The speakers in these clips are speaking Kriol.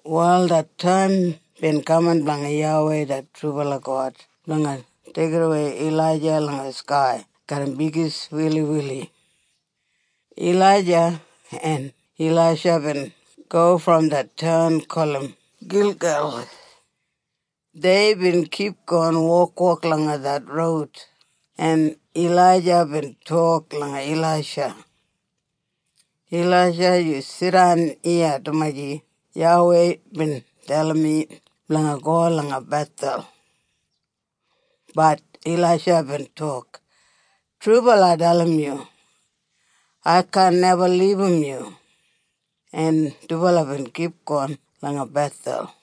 Wal det taim bin kaman blanga YAWEI det trubala God blanga deigimwei Ilaija langa skai garram bigis wiliwili. Ilaija en Ilaisha bin go brom det taun gulum Gilgel. Deibin kipgon wokwok langa det roud en Ilaija bin tok langa Ilaisha, “Ilaisha yu jidan iya dumaji YAWEI bin dalim mi blanga go langa Bethel.” Bat Ilaisha bin tok, “Trubala ai dalim yu. Ai kaan neba libum yu.” En dubala bin kipgon langa Bethel.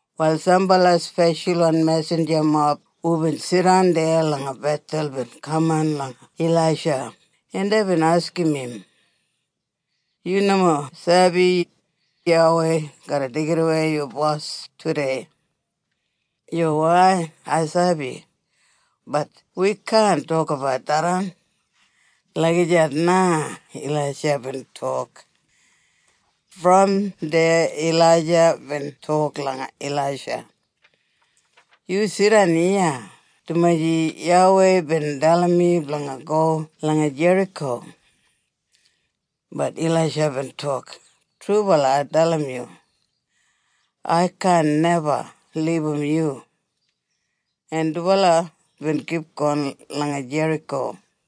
Wal sambala speshalwan mesinjamob hubin jidan deya langa Bethel bin kaman langa Ilaisha en deibin askim im, “Yu nomo sabi, YAWEI garra deigimwei yu bos tudei?” “Yuwai ai sabi, bat wi kaan tokabat tharran.” Lagijat na Ilaisha bin tok. Brom deya Ilaija bin tok langa Ilaisha, “Yu jidan iya dumaji YAWEI bin dalim mi blanga go langa Jeriko.” Bat Ilaisha bin tok, “Trubala ai dalim yu. Ai kaan neba libum yu.” En dubala bin kipgon langa Jeriko.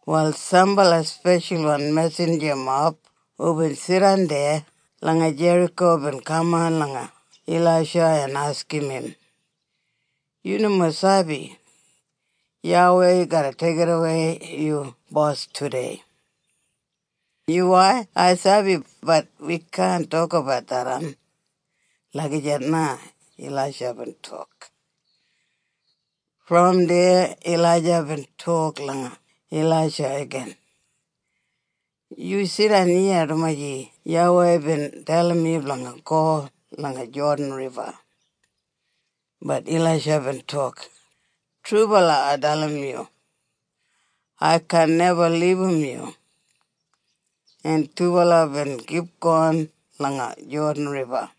Wal sambala speshalwan mesinjamob hubin jidan deya langa Jeriko bin kaman langa Ilaisha en askim im, “Yu nomo sabi, YAWEI garra deigimwei yu bos tudei?” “Yuwai ai sabi, bat wi kaan tokabat tharran.” Lagijat na Ilaisha bin tok. Brom deya Ilaija bin tok langa Ilaisha igin, “Yu jidan iya dumaji YAWEI bin dalim mi blanga go langa Jodan Riba.” Bat Ilaisha bin tok, “Trubala ai dalim yu. Ai kaan neba libum yu.” En dubala bin kipgon langa Jodan Riba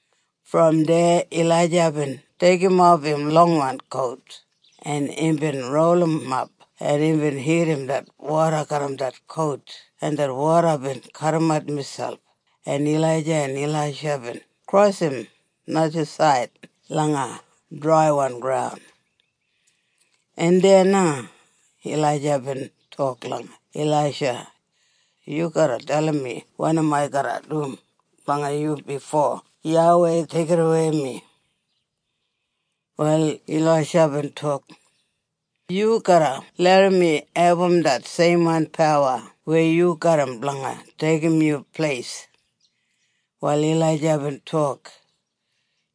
Brom deya Ilaija bin deigimof im longwan kout en imbin rolimap en imbin hitim det woda garram det kout en det woda bin kadimat miselp en Ilaija en Ilaisha bin krosim najasaid langa draiwan graun. En deya na Ilaija bin tok langa Ilaisha, “Yu garra dalim mi wanim ai garra dum blanga yu bifo YAWEI deigidawei mi.” Wal Ilaisha bin tok, “Yu garra larram mi abum det seimwan pawa weya yu garram blanga deigim yu pleis.” Wal Ilaija bin tok,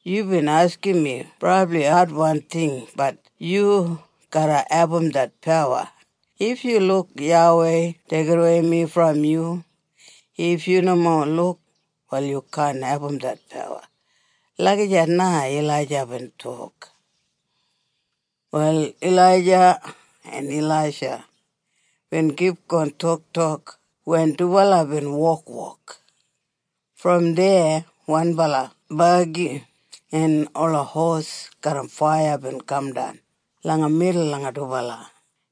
“Yubin askim mi brabli adwan ting bat yu garra abum det pawa if yu luk YAWEI deigimwei mi brom yu. If yu nomo luk, wal yu kaan abum det pawa.” Lagijat na Ilaija bin tok. Wal Ilaija en Ilaisha bin kipgon toktok wen dubala bin wokwok. Brom deya wanbala bagi en ola hosis garram faiya bin kamdan langa midul langa dubala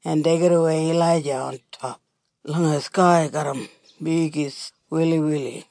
en deigimwei Ilaija ontop langa skai garram bigis wiliwili.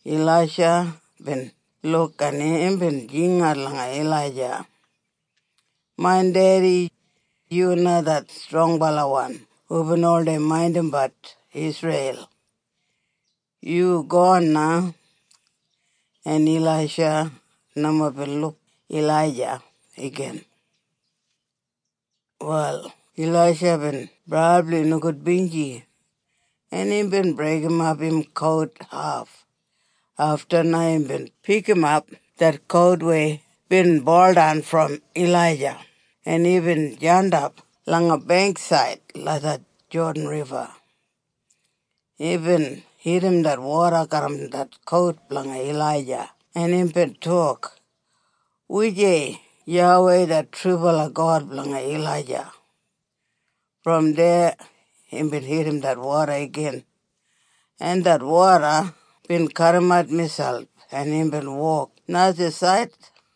Ilaisha bin luk en imbin jingat langa Ilaija, “Main dedi, yu na det strongbalawan hubin oldei maindimbat Isreil. Yu gon na.” En Ilaisha nomo bin luk Ilaija igin. Wal Ilaisha bin brabli nogudbinji en imbin breigimap im kout haf. Afta na imbin pikimap det kout weya bin buldan brom Ilaija en imbin jandap langa beingksaid langa det Jodan Riba. Imbin hitim det woda garram det kout blanga Ilaija en imbin tok, “Wujei YAWEI det trubala God blanga Ilaija?” Brom deya imbin hitim det woda igin en det woda bin kadimat miselp en imbin wok najasaid.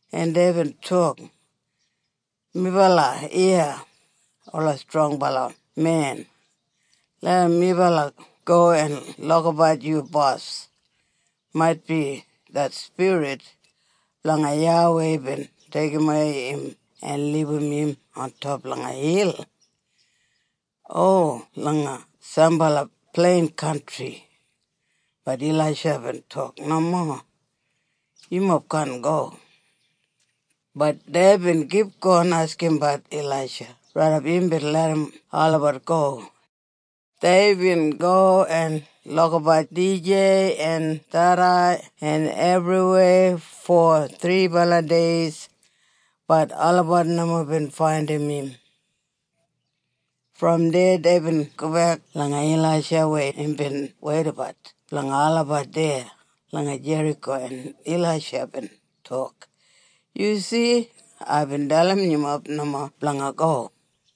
en deibin tok, “Melabat iya ola strongbala men. Larram melabat go en lukabat yu bos. Maitbi det spirit blanga YAWEI bin deigimwei im en libum im ontop langa hil, o langa sambala plein kantri.” Bat Ilaisha bin tok, “Nomo. Yumob kaan go.” Bat deibin kipgon askimbat Ilaisha raidap imbin larram olabat go. Deibin go en lukabat dijei en tharrei en ebriweya fo thribala deis bat olabat nomo bin faindim im. Brom deya deibin gobek langa Ilaisha weya imbin weidabat blanga olabat deya langa Jeriko en Ilaisha bin tok, “Yu si. Aibin dalim yumob nomo blanga go.”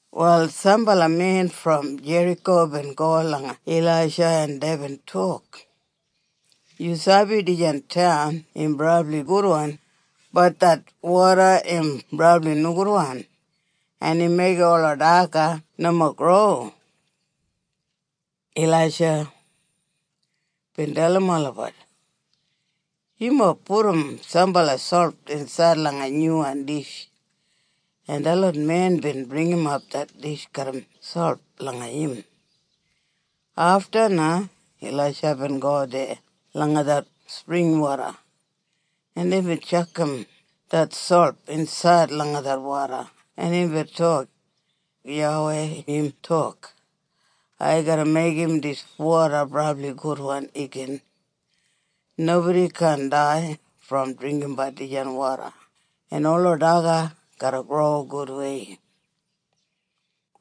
Wal sambala men brom Jeriko bin go langa Ilaisha en deibin tok, “Yu sabi dijan taun im brabli gudwan bat det woda im brabli nogudwan en im meigim ola daga nomo gro.” Ilaisha bin dalim olabat, “Yumob pudum sambala solt insaid langa nyuwan dish.” En detlot men bin bringimap det dish garram solt langa im. Afta na Ilaisha bin go deya langa det springwoda en imbin tjakam det solt insaid langa det woda en imbin tok, “YAWEI im tok, ‘Ai garra meigim dis woda brabli gudwan igin. Nobodi kaan dai brom dringgimbat dijan woda en ola daga garra gro gudwei.’”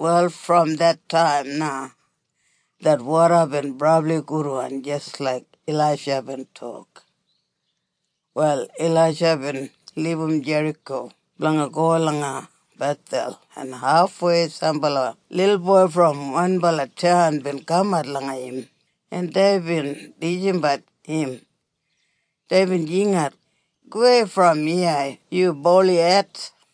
Wal brom det taim na det woda bin brabli gudwan jis laik Ilaisha bin tok. Wal Ilaisha bin libum Jeriko blanga go langa Bethel en hafwei sambala lilboi brom wanbala taun bin kamat langa im en deibin tisimbat im. Deibin jingat, “Gowei brom iya yu bolihed!”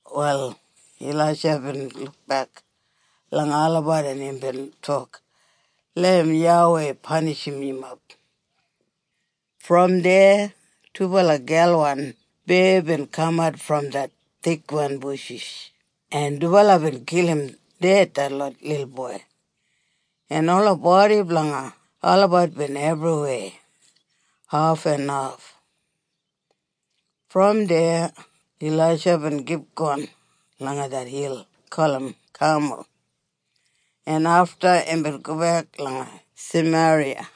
Wal Ilaisha bin lukbek langa olabat en imbin tok, “Larram YAWEI panishim yumob.” Brom deya dubala gelwan beya bin kamat brom det thikwan bushis en dubala bin kilim ded detlot lilboi, en ola bodi blanga olabat bin ebriweya haf en haf. Brom deya Ilaisha bin kipgon langa det hil gulum Kamul en afta imbin gobek langa Sameriya.